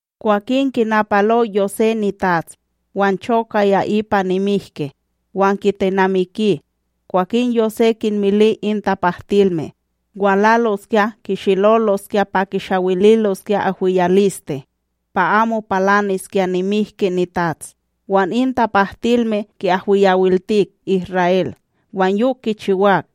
Kwakin kinapalo Yosé nitats, wan chokaya ipa nimihki, wan kitenamiki. Kwakin Yosé kinmili in tapahtilme walaloskya kishiloloskya pa kishawililoskya ahwiyawiliste pa amo palaniskya nimihki nitats, wan in tapahtilme ki'ahwiyawiltik Isra'El, wan yok kichiwak.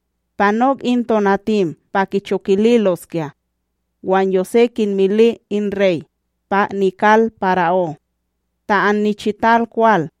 Panok in tonatim pa kichokililoskya, wan Yosé kinmili in rey pa nikal para'ó: ―Ta annichital kwal,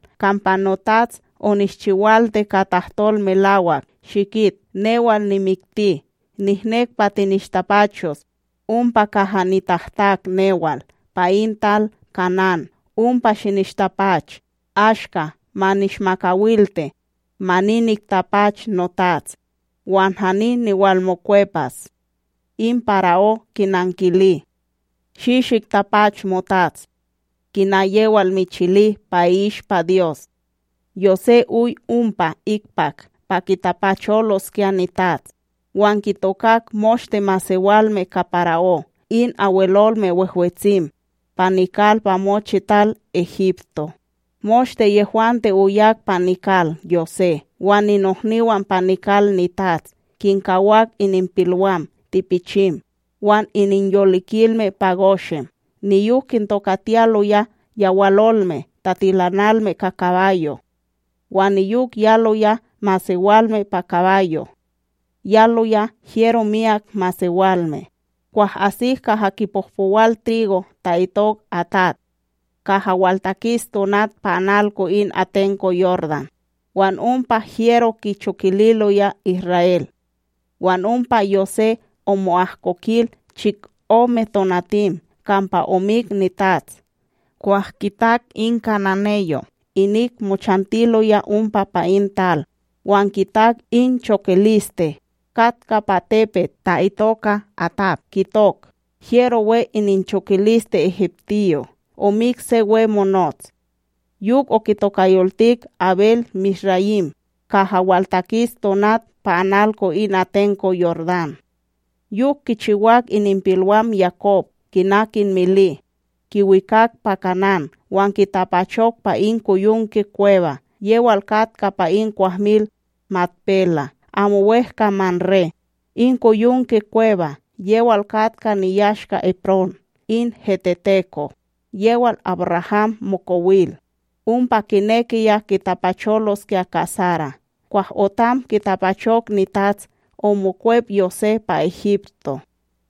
kampa notats, onishchiwalti ka tahtol melawak shikit newal nimikti, nihnek pa tinishtapachos ompa kaha nitahtak newal pa in tal Kanán ompa shinishtapach. Ashka ma nishmakawalti, ma ni niktapach notats, wan hani niwalmokwepas. In para'ó kinankili: ―Shi shiktapach motats, kina yewal michili pa i'ishpa Dyos. Yosé oy ompa ikpak pa kitapacholoskya nitats wan kitokak moshte masewalme ka para'ó, in Abwelolme Wehwetsim pa nikal pa mochi tal Egipto. Moshte yehwante oyak pa nikal Yosé, wan ninohniwan pa nikal nitats. Kinkawak ininpilwam tipichim wan ininyolikilme pa Goshen. Niyok kintokatiyaloya yawalolme tatilanilme ka kabayo', wan niyok yaloya masewalme pa kabayo', yaloya hyero myak masewalme. Kwah asik kaha kipohpowal trigo ta'itok Atad, kaha waltakis tonat pa analko in atenko Yordán, wan ompa hyero kichokililoya Isra'El. Wan ompa Yosé omo'ahkokil chikome tonatim kampa omik nitats. Kwah kitak in kananeyo', inik mochantiloya ompa pa in tal wan kitak in chokiliste katka pa tepet ta'itoka Atad kitok: “Hyero we ininchokiliste egiptiyo', omik se wemonots.” Yok okitokayoltik Abel-misrayima kaha waltakis tonat pa analko in atenko Yordán. Yok kichiwak ininpilwam Yakob kina kinmili: Kiwikak pa Kanán wan kitapachok pa in koyonke kweba yewal katka pa in kwahmil Makpela, amo wEhka Mamré, in koyonke kweba yewal katka niyashka Eprón in heteteko yewal AbRaham mokowil, ompa kinekiya kitapacholoskya ka Sara. Kwah otam kitapachok nitats, omokwep Yosé pa Egipto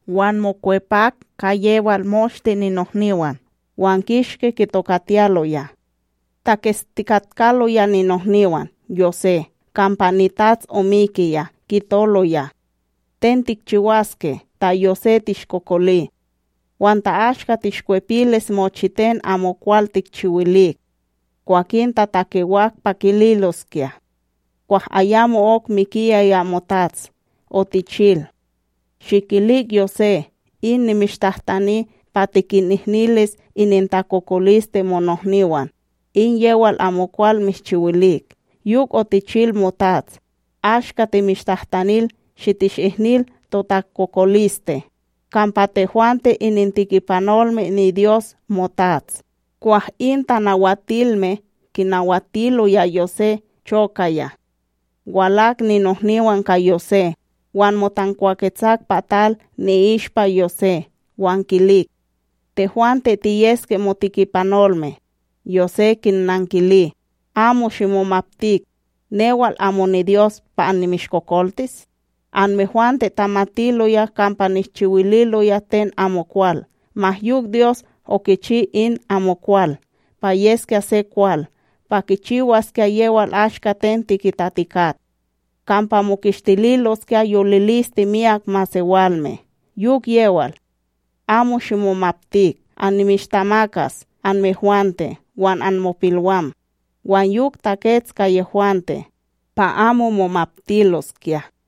wan mokwepak ka yewal moshte ninohniwan wan kishki kitokatiyaloya. Taketstikatkaloya ninohniwan Yosé kampa nitats omikiya kitoloya: “Ten tikchiwaske ta Yosé tishkokoli, wan ta ashka tishkwepilis mochiten amokwal tikchiwilik.” Kwakin tatakewak pa kililoskya: “Kwah ayamo'ok mikiyaya motats, otichil: ‘Shikilik Yosé in nimishtahtani pa tikinihnilis inintakokoliste monohniwan, in yewal amokwal mishchiwilik.’ Yok otichil motats ashka timishtahtanil shitishihnil totakokoliste, kampa tehwante inintikipanolme niDyos motats.” Kwah in tanawatilme kinawatiloya Yosé chokaya. Walak ninohniwan ka Yosé, wan motankwaketsak pa tal ni'ishpa Yosé wan kilik: ―Tehwante tiyeske motikipanolme. Yosé kinnankili: ―Amo shimomaptik. Newal amo niDyos pa annimishkokoltis? Anmehwante tamatiloya kampa nishchiwililoya ten amokwal, ma yok Dyos okichi in amokwal pa yeskya se kwal pa kichiwaskya yewal ashka ten tikitatikat: Kampa mokishtililoskya yoliliste myak masewalme. Yok yewal, amo shimomaptik! Annimishtamakas anmehwante wan anmopilwam. Wan yok, takets ka yehwante pa amo momaptiloskya.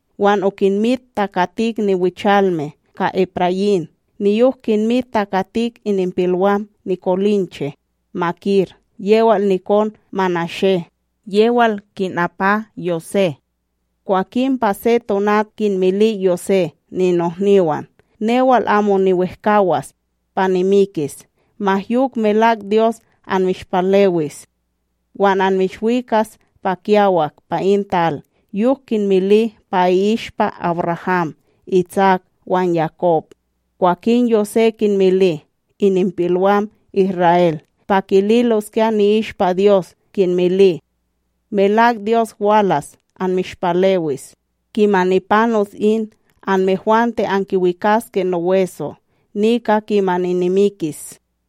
wan okinmit takatik niwichalme ka Eprayím niyok kinmit takatik ininpilwam nikolinche. Makir yewal nikon Manashé, yewal kinapa Yosé. Kwakin pa se tonat, kinmili Yosé ninohniwan: “Newal amo niwehkAwas pa nimikis, ma yok melak Dyos anmishpalewis, wan anmishwikas pa kiyawak pa in tal yok kinmili pa i'ishpa AbRaham, Itsak wan Yakob.” Kwakin Yosé kinmili ininpilwam Isra'El pa kililoskya ni'ishpa Dyos kinmili: “Melak Dyos walas anmishpalewis. Kimani panos in, anmehwante ankiwikaske noweso nika kimani nimikis.”